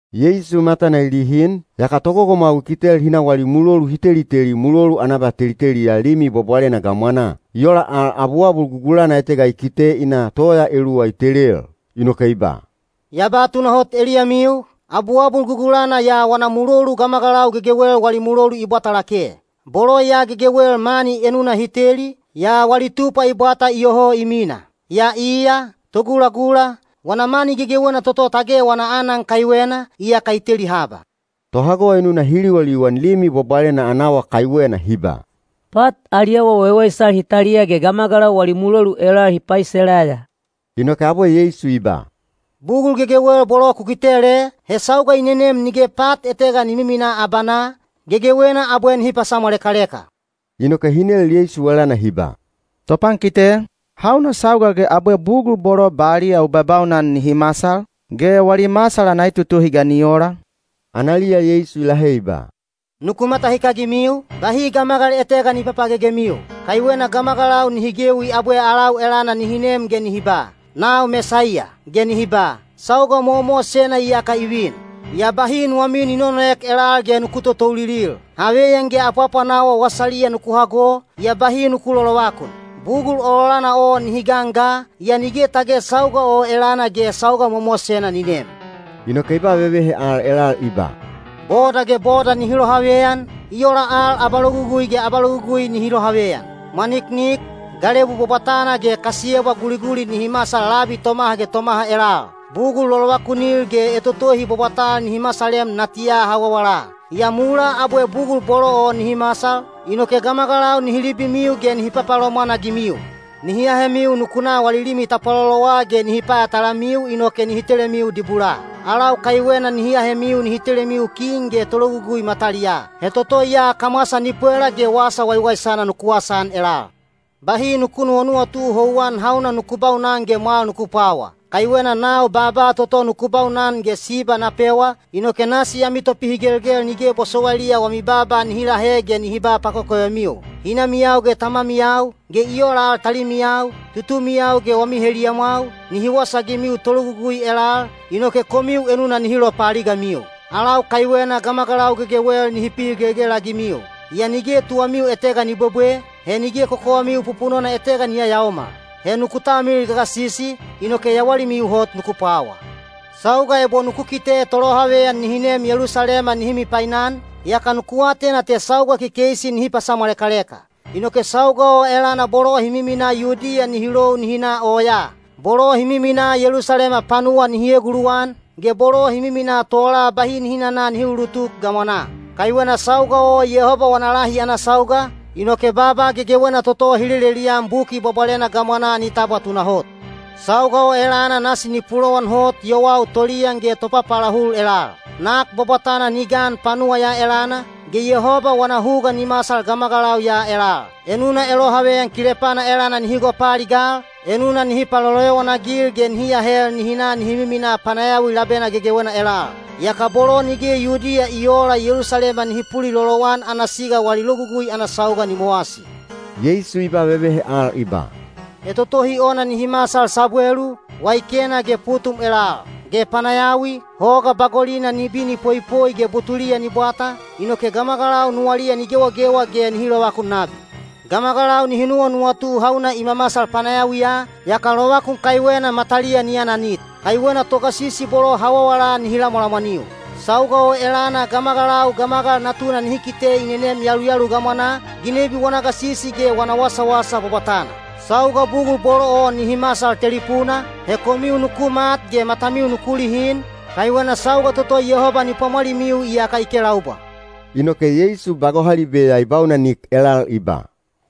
Yeisu matana i lihin, yaka togogomwau i kitel hi na wali mulolu hi teliteli mulolu ana abateliteliya Limi Bwabwalena gamwanaa. I ola al abuabul gugulana etega i kite i na toya eluwa i telel. Inoke i ba, “Ya ba tunahot eliyamiu, abuabul gugulana ya wana mulolu gamagalau gegewel wali mulolu i bwata lake. Bolo ya gegewel mani enuna hi teli, yaa wali tupwa i bwata iyoho i mina. Yaa iya, togulagula, wana mani gegewena toto tage wana aanan kaiwena, iyaka i teli haba.” Tohago enuna hi liwaliwan Limi Bwabwalena ana awa kaiwena hi ba, “Pat ali awa waiwaisal hi taliya ge gamagalau wali mulolu elal hi paiselaya.” Inoke abwe Yeisu i ba, “Bugul gegewel bolo ku kitel e, he sauga i nenem nige pat etega ni miminaa abanaa, gegewena abwe nihi pasamwalekaleka.” Inoke hi nel Yeisu elana hi ba, “Topankite, hauna sauga ge abwe bugul bolo baliya u babaunan nihi masal? Ge wali masal ana etotohi ga ni ola?” Analiya Yeisu i lahe i ba, “Nuku matahikagimiu, bahi gamagal etega ni papagegemiu. Kaiwena gamagalau nihi gewi abwe alau elana nihi nem ge nihi ba, ‘Nau Mesaiya!’ ge nihi ba, ‘Sauga mowamowasena iyaka i vin.’ Yaa bahi nuwamiu ni nonoek elal ge nuku totoulilil. Haveyan ge apwaapwanawa wasaliya nuku hago, yaa bahi nuku lolovakun. Bugul ololana o nihi gan ga, yaa nige tage sauga o elana ge sauga mowamowasena ni nem.” Inoke i ba vevehe al elal i ba, “Boda ge boda nihi lohaveyan, i ola al abalogugui ge abalogugui nihi lohaveyan. Mwaniknik, galebu bwabwatana ge kasiyebwa guliguli nihi masal labi tomaha ge tomaha elal. Bugul lolovakunil ge etotohi bwabwatal nihi masalem natiya hawawala. “Yaa mulaa abwe bugul bolo o nihi masal, inoke gamagalau nihi libimiu ge nihi papalomwan-agimiu. Nihi ahemiu nuku na wali limi tapwalolowa ge nihi payatalamiu inoke nihi telemiu dibulaa. Alau kaiwena nihi ahemiu nihi telemiu kin ge tologugui mataliyaa. He toto ya kamwasa ni pwela ge wasa waiwaisana nuku wasaan elal. Bahi nuku nuwanuwatu houwan hauna nuku baunan ge mwal nuku pwawa. Kaiwena nau baaba toto nuku baunan ge siba na pewa, inoke nasi ami topihigelgel nige bosowailiya wami baaba nihi lahe ge nihi ba pakokovemiu. Hinamiyau ge tamamiyau, ge i ola al talimiyau, tutumiyau ge wami heliyamwau, nihi wasaagimiu tologugui elal, inoke komiu enuna nihi lopaaligamiu. Alau kaiwena gamagalau gegewel nihi pihigelgel-agimiu. Yaa nige tuwamiu etega ni bwebwe, he nige kokowamiu pupunona etega ni yayaomal. He nuku talmilil gagasisi, inoke yawalimiu hot nuku pwawa.” “Sauga ebo nuku kite tolohaveyan nihi nem Yelusalema nihi mipainan, yaka nuku atena te sauga kekeisi nihi pasamwalekaleka. Inoke sauga o elana bolo hi miminaa Yudiya nihi lou nihi na oyaa; bolo hi miminaa Yelusalema panuwa nihi eguluwan, ge bolo hi miminaa tola bahi nihi nana nihi uulutuk gamwanaa. Kaiwena sauga o Yehoba wana lahi ana sauga, inoke baaba gegewena toto hi lelelian Buki Bwabwalena gamwanaa ni tabwa tunahot. Sauga o elana nasi ni pulowan hot yowau toliyan ge topapaalahul elal. Nak bwabwatana ni gan panuwa ya elana, ge Yehoba wana huga ni masal gamagalau ya elal. Enuna elohaveyan kilepana elana nihi gopaaligal, enuna nihi paloloyowan-agil ge nihi ahel nihi na nihi miminaa panayawi labena gegewena elal. Yaka bolo nige Yudiya i oola Yelusalema nihi pulilolowan ana siga wali logugui ana sauga ni mowasi.” Yeisu i ba vevehe al i ba, “Etotohi ona nihi masal sabwelu, weikena, ge putum elal. Ge panayawiya, hoga bagolina ni bini poipoi ge butuliya ni bwata, inoke gamagalau nuwaliya ni gewagewa ge nihi lovakun nabi. Gamagalau nihi nuwanuwatu hauna i mamasal panayawiya, yaka lovakun kaiwena mataliya ni ananit. Kaiwena togasisi bolo hawawala nihi lamwalamwaniu. Sauga o elana gamagalau Gamagal Natuna nihi kite i nenem yaluyalu gamwanaa, ginebi wana gasisi ge wana wasawasa bwabwatana. Sauga bugul bolo o nihi masal telipuna, he komiu nuku mat ge matamiu nuku lihin, kaiwena sauga toto Yehoba ni pwamwalimiu iyaka i kelaubwa.” Inoke Yeisu ba gohalibe ya i baunanik elal i ba,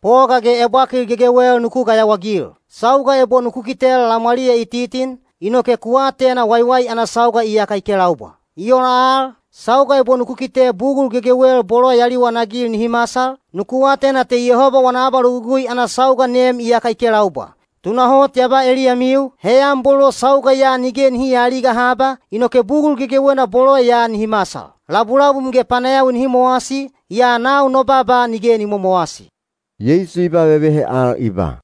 “Poga ge ebwakil gegewel nuku gayawaagil. Sauga ebo nuku kitel lamwaliya i titin, inoke ku atena waiwai ana sauga iyaka i kelaubwa. I ola al, sauga ebo nuku kite bugul gegewel bolo ya liwanagil nihi masal, nuku atena te Yehoba wana abalogugui ana sauga nem iyaka i kelaubwa. “Tunahot ya ba eliyamiu, heyan bolo sauga ya nige nihi aaliga haba, inoke bugul gegewena bolo ya nihi masal. Labulabum ge panayawi nihi mowasi, yaa nau no baaba nige ni momowasi.” Yeisu i ba vevehe al i ba,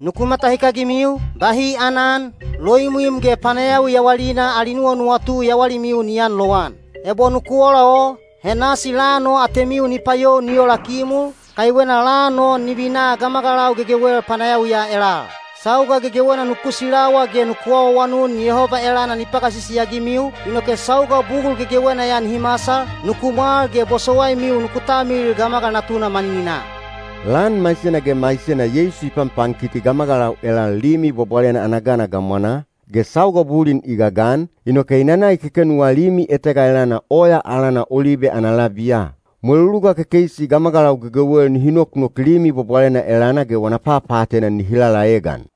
“Nuku matahikagimiu, bahi aanan, loimwim ge panayawi yawalina ali nuwanuwatu yawalimiu ni aanlowan. Ebo nuku ola o, he nasi lan o atemiu ni payou ni ola kimul, kaiwena lan o ni vina gamagalau gegewel panayawiya elal. Sauga gegewena nuku silawa ge nuku awaawanun Yehoba elana ni pagasisi-agimiu, inoke sauga bugul gegewena ya nihi masal, nuku mwal ge bosowaimiu nuku talmilil Gamagal Natuna manininaa.” Lan maisena ge maisena Yeisu i panpankiti gamagalau elal Limi Bwabwalena ana gana gamwanaa, ge sauga bulin i gagan, inoke i nana i kekenuwa limi etega elana oya alana Olibe ana labiya. Mweluluga kekeisi gamagalau gegewel nihi noknok Limi Bwabwalena elana ge wana papaatena nihi lalaegan.